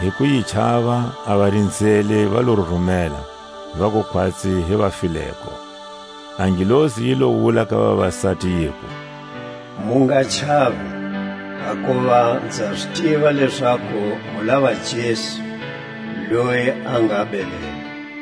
Hi ku yi chava a varinzeli va lo rurumela, vaku khwatsi hi vafileko. A ngelosi yi lo wula ka vavasati, yiku: Mu nga chavi; hakuva nza zi tiva lezaku mu lava Jesu, loye a nga belelwe.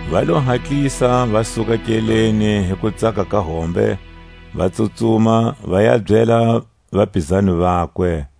Va lo hatlisa va suka nkeleni hi kutsaka ka hombe, va tsutsuma va ya byela vapizani vakwe.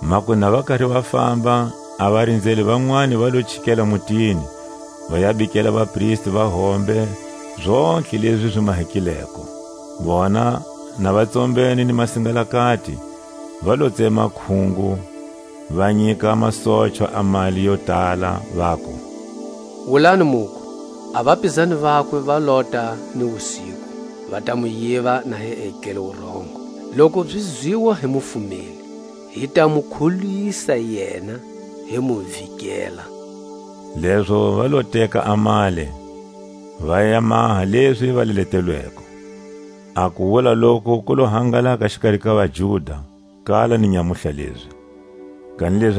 Makunu na va kari va famba, a varinzeli vanwani va lo chikela mutini, va ya bikela vapristi va hombe zontlhe lezi zi mahekileko. Vona na va tsombene ni masingalakati, va lo tsema khungo, va nyika masochwa a mali yo tala, vaku: Wulani muku: A vapizani vakwe va lota ni wusiku, va ta mu yiva na hi etlele wurongo. Loku zi zwiwa hi mufumeli, hi ta mu kholwisa yena, hi mu vikela. Lezo va lo teka a mali, va ya maha lezi va leletelweko. A kuwula loku ku lo hangalaka xikari ka vaJuda kala ni nyamutlha lezi. Jesu a woneka ka vapizani vakwe.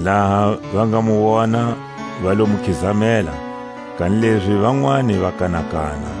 Laha va nga mu wona, va lo mu khizamela, kanilezi vanwani va kanakana.